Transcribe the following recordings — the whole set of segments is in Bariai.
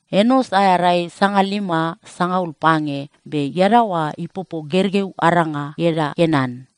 Enos aea rai sangalima sangaul pange, be iadaoa ipopo gergeu aranga ieda Kenan.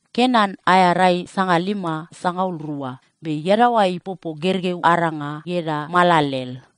Kenan aea rai sangalima sangaul rua, be iadaoa ipopo gergeu aranga ieda Maalalel.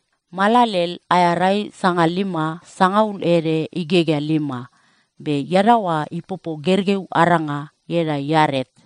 Maalalel aea rai sangalima sangaul ede igegea lima, be iadaoa ipopo gergeu aranga ieda Iaret.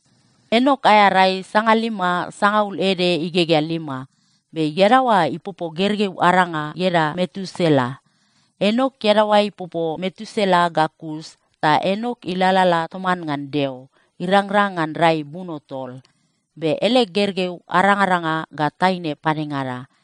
Enok aea rai sangalima sangaul ede igegea lima, be iadaoa ipopo gergeu aranga ieda Metusela. Enok iadaoa ipopo Metusela ga kus ta Enok ilalala toman ngan Deo irangrang ngan rai buno tol. Be ele gergeu arangaranga ga taine padengada.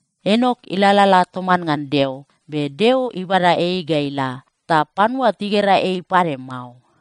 Enok ilalala toman ngan Deo. Be Deo ibada ei ga ila, ta panua tigera ei pade mao.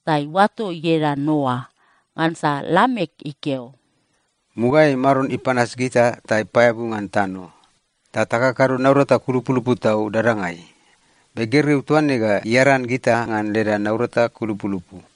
ta iuato ieda Noa. Ngansa Lamek ikeo, “Mugaeai Maron ipanas gita ta ipaeabu ngan tano, ta takakado naurata kulupulupu tau dadangai. Be gergeu toa ne ga iaran gita ngan leda naurata kulupulupu.”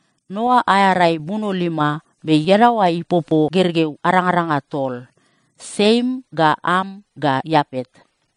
Noa aea rai buno lima, be iadaoa ipopo gergeu arangaranga tol: Siem ga Am ga Iapet.